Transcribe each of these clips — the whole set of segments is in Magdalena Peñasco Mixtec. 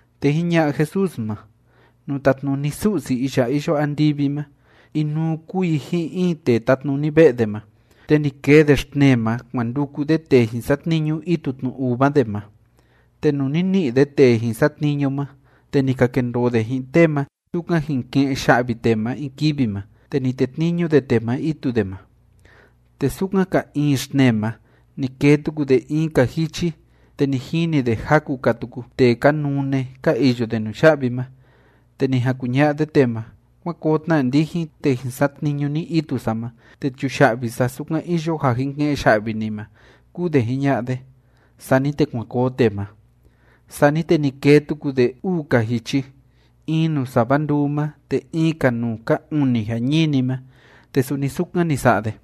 Te jiña'a Jesús ma: ―Nuu tatnuni Su'si iya iyo andivi ma, inuu kúu i ji'in in tee tátnuni ve'e de ma, te ni kee de xtnee ma kuan nduku de tee jin satniñu itu tnu uva de ma. Te nuu ni ni'i de tee jin satniñu ma, te ni ka kendoo de ji'in tee ma sukan jin ke'en ya'vi tee ma in kivi ma, te ni tetniñu de tee ma itu de ma. Te sukan ka iin xtnee ma ni kee tuku de in‑ka jichi, te ni jini de jaku‑ka tuku tee ka nune, ka iyo de nuya'vi ma. Te ni jan kuña'a de tee ma: “Kuan koo tna ndijin, te jin satniñu ni itu sa ma, te chuya'vi sa sukan iyo ja jin ke'en ya'vi ni ma”, kúu de jiña'a de. Sani te kuan koo tee ma. Sani te ni kee tuku de uu‑ka jichi, in nuu sava nduu ma te in‑ka nuu ka uni jañini ma, te suni sukan ni sa'a de.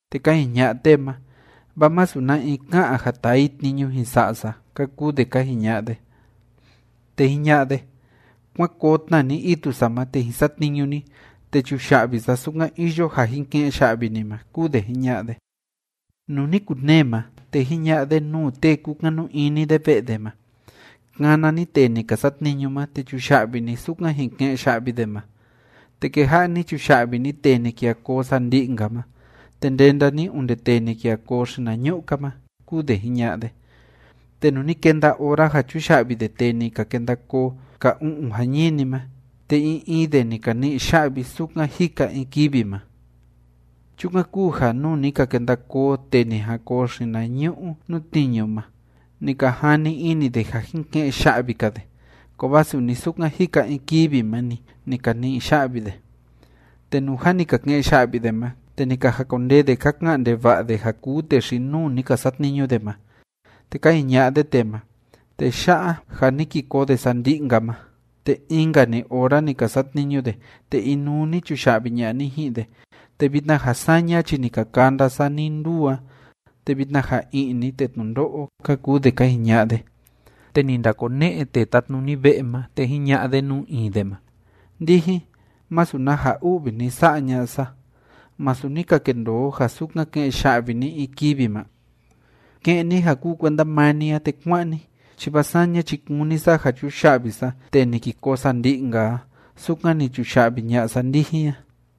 Te ka jiña'a tee ma: “Vaa masu na in ká'an ja taa i tniñu jin sa'a sa”, ka kuu de ka jiña'a de. Te jiña'a de: “Kuán koo tna ni itu sa ma, te jin satniñu ni, te chuya'vi sa sukan iyo ja jin ke'en ya'vi ni ma”, kúu de jiña'a de. ’Nuu ni kunee ma, te jiña'a de nuu tee kúkanu ini de ve'e de ma: “Kana ni tee ni ka satniñu ma, te chuya'vi ni sukan jin ke'en ya'vi de ma. Te keja'a ni chuya'vi ni tee ni kija koo sandi'i‑nka ma, te ndenda ni onde tee ni kija koo xinañu'u‑ka ma”, kúu de jiña'a de. Te nuu ni kenda ora ja chuya'vi de tee ni ka kenda koo ka u'un jañini ma, te in in de ni ka ni'i ya'vi sukan jika in kivi ma. Chukan kúu ja nuu ni ka kenda koo tee ni jan koo xinañu'u nuu tniñu ma, ni ka jani ini de ja jin ke'en ya'vi‑ka de. Kovaa suni sukan jika in kivi ma‑ni, ni ka ni'i ya'vi de. Te nuu jâ ni ka ke'en ya'vi de ma, te ni ka jakondee de ka ka'an ndeva'a de ja kuu tee xi‑nuu ni ka satniñu de ma. Te ka jiña'a de tee ma: “Tee ya'a, ja ni ki koo de sandi'i‑nka ma, te in‑nka‑ni ora ni ka satniñu de, te inuu ni chuya'vi ña'a ni ji'in de, te vitna ja saña chi ni ka kanda sa ni‑nduu a, te vitna ja i'ni te tnundo'o”, ka kuu de ka jiña'a de. Te ni ndakone'e tee tátnuni ve'e ma, te jiña'a de nuu in de ma: “Ndijin, masu na ja u'vi ni sa'a ña'a sa. ¿Masu ni ka kendoo o ja sukan ke'en ya'vi ni in kivi ma? Ke'en ni ja kuu kuenda maa ni a, te kuá'an ni, chi vaa saña chi kúni sa ja chuya'vi sa tee ni ki koo sandi'i‑nka a sukan ni chuya'vi ña'a sa ndijin a.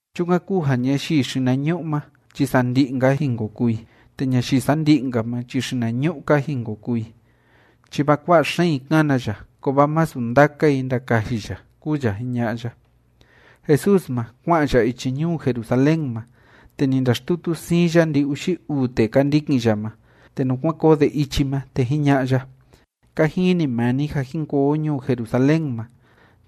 ’Chukan kúu ja ñayii xinañu'u ma chi sandi'i‑nka jin ko kuu i, te ñayii sandi'i ma chi xinañu'u‑ka jin ko kuu i. Chi vaa kua'a xeen i kana ya, kovaa masu ndaka i ndakaji ya ―kúu ya jiña'a ya. Jesús ma, kua'an ya ichi ñuu Jerusalén ma. Te ni ndaxtutu siin ya ndi‑uxi uu tee ka ndikin ya ma, te nuu kuan koo de ichi ma, te jiña'a ya: ―Ka jini maa ni ja jin koo o ñuu Jerusalén ma.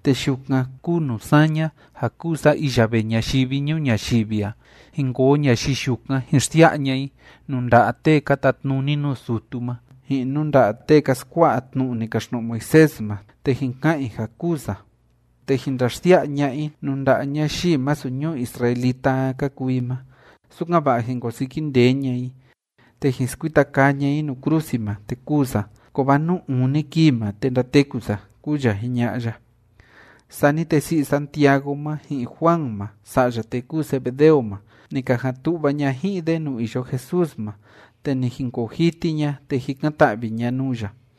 Te yukan kúu nuu saña ja kúu sa iya vee ñayivi ñuu ñayivi a, jin koo ñayii yukan jin xsia'a ña'a i nuu nda'a tee ka tatnuni nuu sutu ma, ji'in nuu nda'a tee ka skua'a tnu'u ni kaxtnu'u Moisés ma, te jin ka'an i ja kûu sa, te jin ndaxsia'a ña'a i nuu nda'a ñayii masu ñuu israelita a ka kuu i ma, sukan‑va'a jin kosiki ndee ña'a i, te jin skuita kaa ña'a i nuu krusi ma, te kûu sa. Kovaa nuu uni kii ma, te ndateku sa ―kúu ya jiña'a ya. Sani te si'i Santiago ma ji'in Juan ma sa'ya tee kúu Zebedeo ma, ni ka jan tu'va ña ji'in de nuu iyo Jesús ma, te ni jinkoo jiti ña, te jikan‑ta'vi ña nuu ya.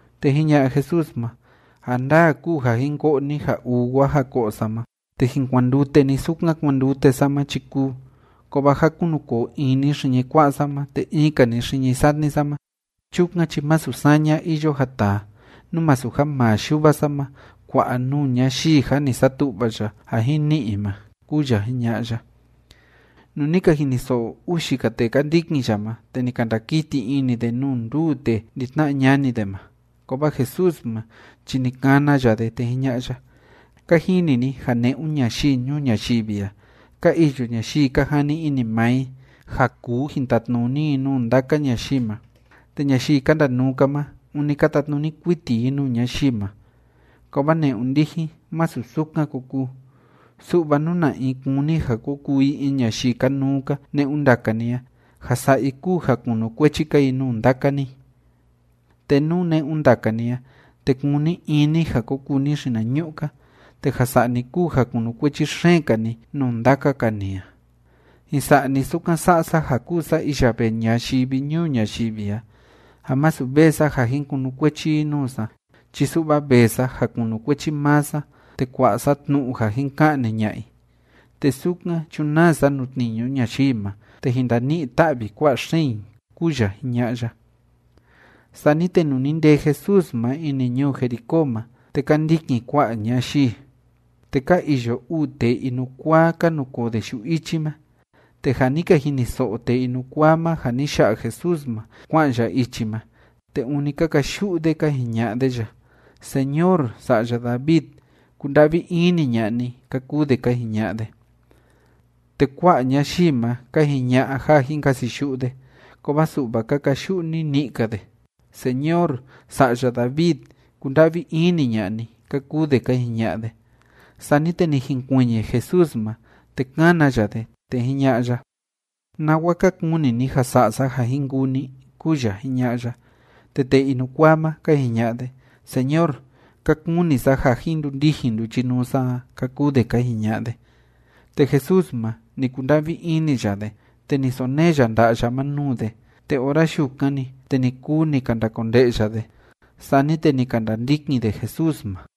Te jiña'a Jesús ma: ―Ja ndaa kúu ja jin ko'o ni ja uwa ja ko'o sa ma, te jin kuandute ni sukan kuandute sa ma chi kúu, kovaa ja kunukoo in ni xiñi kua'a sa ma te in‑ka ni xiñi satni sa ma, chukan chi masu saña iyo ja taa, nú masu ja maa Yuva sa ma kua'a nuu ñayii ja ni satu'va ya ja jin ni'i i ma ―kúu ya jiña'a ya. Nuu ni ka jiniso'o uxi‑ka tee ka ndikin ya ma, te ni ka ndakiti ini de nuu nduu tee ndi‑tna'a ñani de ma. Kovaa Jesús ma chi ni kana ya de, te jiña'a ya: ―Ka jini ni ja ne'un ñayii ñuu ñayivi a, ka iyo ñayii ka jani ini maa i ja kuu jin tatnuni i nuu ndaka ñayii ma, te ñayii ka ndanuu‑ka ma, ûni ka tatnuni kuiti i nuu ñayii ma. Kovaa ne'un ndijin, masu sukan ko kuu, su'va nú na in kúni ja ko kuu i in ñayii kanuu‑ka ne'un ndaka ni a, ja sa'a i kúu ja kunukuechi‑ka i nuu ndaka ni, te nú ne'un ndaka ni a, te kúni in ni ja ko kuu ni xinañu'u‑ka, te ja sa'a ni kúu ja kunukuechi xeen‑ka ni nuu ndaka‑ka ni a. Jin sa'a ni sukan sa'a sa ja kúu sa iya vee ñayivi ñuu ñayivi a, ja masu vee sa ja jin kunukuechi i nuu sa chi su'va vee sa ja kunukuechi maa sa te kua'a sa tnu'u ja jin ka'ni ña'a i, te sukan chunaa sa nuu tniñu ñayii ma, te jin ndani'i‑ta'vi kua'a xeen i ―kúu ya jiña'a ya. Sani te nuu ni ndee Jesús ma ini ñuu Jericó ma, te ka ndikin kua'a ñayii. Te ka iyo uu tee inukuaa, ka nukoo de yu'u ichi ma. Te ja ni ka jiniso'o tee inukuaa ma ja ni ya'a Jesús ma kua'an ya ichi ma, te ûni ka kayu'u de ka jiña'a de ya: ―Señor, Sa'ya David, kunda'vi ini ña'a ni ―ka kuu de ka jiña'a de. Te kua'a ñayii ma ka jiña'a ja jin kasiyu'u de. Kovaa su'va ka kayu'u nini'i‑ka de: ―Señor, Sa'ya David, kunda'vi ini ña'a ni ―ka kuu de ka jiña'a de. Sani te ni jinkuiñi Jesús ma, te kána ya de, te jiña'a ya: ―¿Nawa ka kuni ni ja sa'a sa ja jin kuu ni? ―kúu ya jiña'a ya. Te tee inukuaa ma, ka jiña'a de: ―Señor, ka kuni sa ja jin ndundijin nduchinuu sa a ―ka kuu de ka jiña'a de. Te Jesús ma, ni kunda'vi ini ya de, te ni sonee ya nda'a ya ma nuu de, te ora yukan‑ni, te ni kuu ni ka ndakonde'ya de. Sani te ni ka ndandikin de Jesús ma.